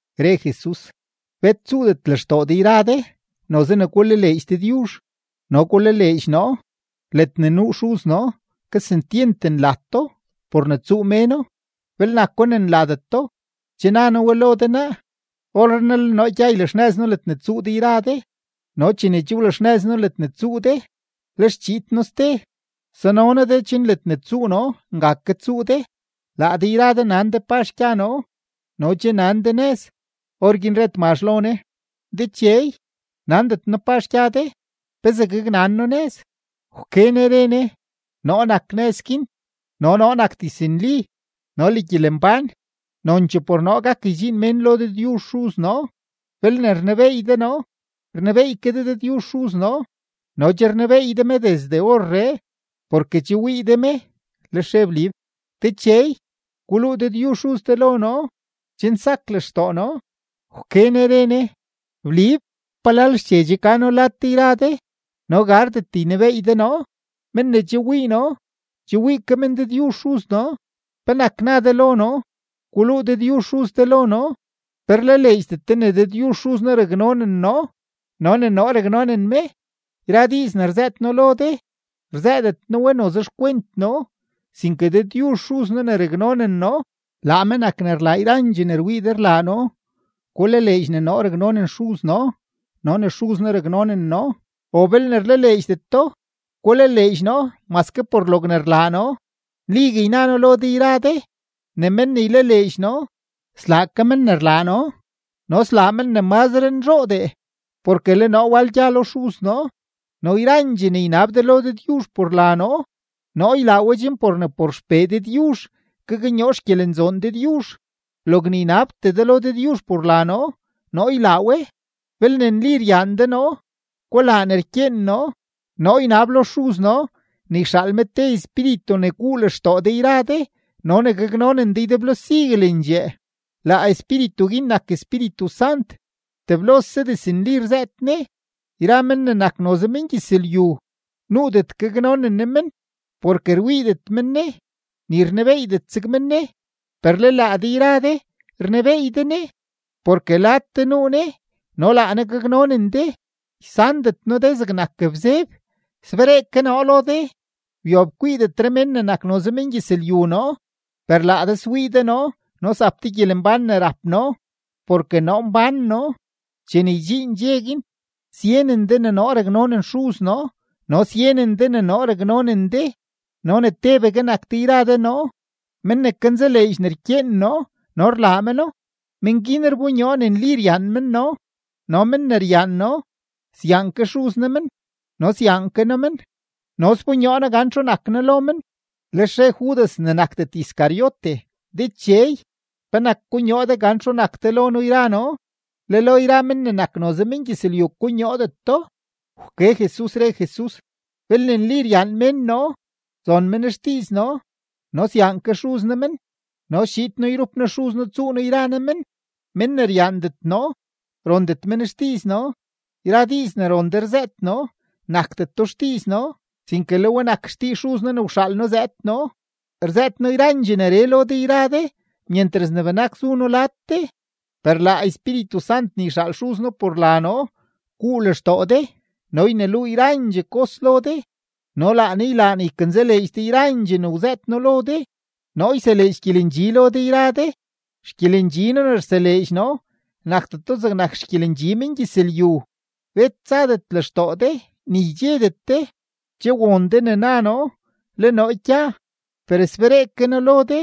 Re Jesus: ―Bet tsuudet lextoo de yra de, noze ne gulaleedx Dëdyuzh no gulaleedx noo. Ledne nuu Xuz noo kesentyent nlato por ne tsuu méno; belne nako ne nlateto, che na noo we lo de naa. Orrenaa le noo gya ylaxnëz noo ledne tsuu de yra de. No chene che wlaxnëz noo ledne tsuu de, lex chiid noo ste, sano noo de chen ledne tsuu noo nga ke tsuu de. Laa de yra de nan de pazh gya noo no che nan de nëz. Orguin re Tmazh lo Ne: ―Dechey, nandet noo pazh gya de; ¿pezee gaknan noo nëz? Wke Ne re Ne: ―Noo nak nëz guin no noo nak diznli no le gyelembán. Nonchee por noo gak ydxiin mén lo Dëdyuzh Xuz noo. Belne rnebeey de noo, rnebeey ke de Dëdyuzh Xuz noo; no che rnebeey de me desde orree, porke che wii de me. Lex re Blib: ―Dechey, guluu Dëdyuzh Xuz de lo noo, chen sak lextoo noo. Wke Ne re Ne: ―¿Blib, palal xche che ka noo lad de yra de no gardet ynebeey de noo? Men ne che wii noo, che wii ke men Dëdyuzh Xuz noo. ¿Penak na de lo noo: “Guluu Dëdyuzh Xuz de lo noo”? ¿Pe rlaleedxdet de ne Dëdyuzh Xuz noo raknonen noo no ne noo raknonen me? Yra diiz ne rzëët noo lo de, rzëëdet noo we noze xkwent noo, sinke Dëdyuzh Xuz noo ne raknonen noo laa me nak ne rlaa yrandxee ne rwii de rlaa noo. Gulaleedx ne noo raknonen Xuz noo no ne Xuz noo raknonen noo, o belne rlaleedxdet do, gulaleedx noo maske por logne rlaa noo. Nligue yna noo lo de yra de ne men ne ylaleedx noo, slaa ke men ne rlaa noo, no slaa men ne mazre nzhoodee, porke le noo wal gya lo Xuz noo. No yrandxee ne ynab de lo Dëdyuzh por la noo, noo ylaa we chen por ne por XPee Dëdyuzh gaknyoo xgyelenzoon Dëdyuzh. Logne ynabtee de lo Dëdyuzh por la noo, noo ylaa we. ’Belne nli ryaan de noo, gulaa ne rkyeen noo. Noo ynab lo Xuz noo ne yxaal me te Espíritu ne guu lextoo de yra de no ne gaknonen de ydeblo siguelendxee; laa Espíritu guin nak Espíritu Sant, teblose diznli rzëët Ne. Yra men ne nak noze mengyëzlyu, nuudet gaknonen Ne men, porke rwiidet men Ne, ni rnebeeydet zeg men Ne. Per le laa de yra de rnebeey de Ne, porke lad de nuu Ne no laa Ne gaknonen de. Ysandet noo de zegnak bzeb; sberee ke noo lo de. Wyob kwiidetre men ne nak noze mengyëzlyu noo, per laa de swii de noo no zap de gyelembán ne rap noo porke noo mbán noo. Chene ydxiin dxe guin, syenen de ne noo raknonen Xuz noo no syenen de ne noo raknonen de no ne tebegue nak de yra de noo. Men ne kanzaleedx ne rkyeen noo no rlaa meno, men guin rbonyoo ne nli ryaan men noo. No men ne ryaan noo, syaan ke Xuz noo men, no syaan ke noo men, no sbonyoo noo gan txu nak noo lo men. Lex re Judas (ne nakdet Iscariote): ―Dechey, ¿penak konyoo de gan txu nak de lo noo yra noo, le lo yra men ne nak noze mengyëzlyu konyoodet do? Wke Jesus, re Jesus: ―Belne nli ryaan mén noo, zon men xdiiz noo no syaan ke Xuz noo men no schiid noo yrup noo Xuz noo tsuu noo yra noo men. Men ne ryaandet noo, rondet men xdiiz noo. Yra diiz ne ron de rzëët noo, nakdeto xdiiz noo, sinke le we nak xdiiz Xuz noo ne wxaal noo zëëd noo. ’Rzëët noo yrandxee neree lo de yra de myentras ne benak zu noo lad de; per laa Espíritu Sant ne yxaal Xuz noo por la noo guu lextoo de no yneluu yrandxee kos lo de, no laa Ne ylaa ne ykanzaleedx de yrandxee ne wzëët noo lo de. ’Noo yseleedx gyelendxi lo de yra de; xgyelendxi noo ne rseleedx noo, nakdeto zegnak xgyelendxi mengyëzlyu. Bet tsadet lextoo de, ni ydxedet de. Che won de ne na noo: “Le noo gya, per sberee ke noo lo de.”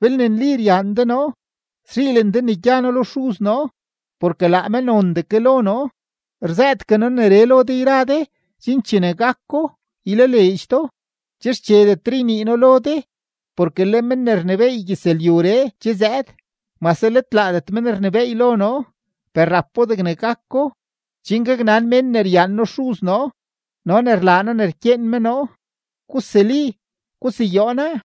Belne nli ryaan de noo, szhiilen de ne gya noo lo Xuz noo porke laa me nondee ke lo noo. Rzëëtgue noo neree lo de yra de chen chene gako, ylaleedx do. ’Che xchedetre ynii noo lo de, porke le men ne rnebééy gyëzlyuree che zëëd. Mase let laadet men rnebééy lo noo, per rapo degne gako, chen gaknan mén ne ryaan noo Xuz noo no ne rlaa noo ne ykyeen me noo. Gusuli, guseyoo naa.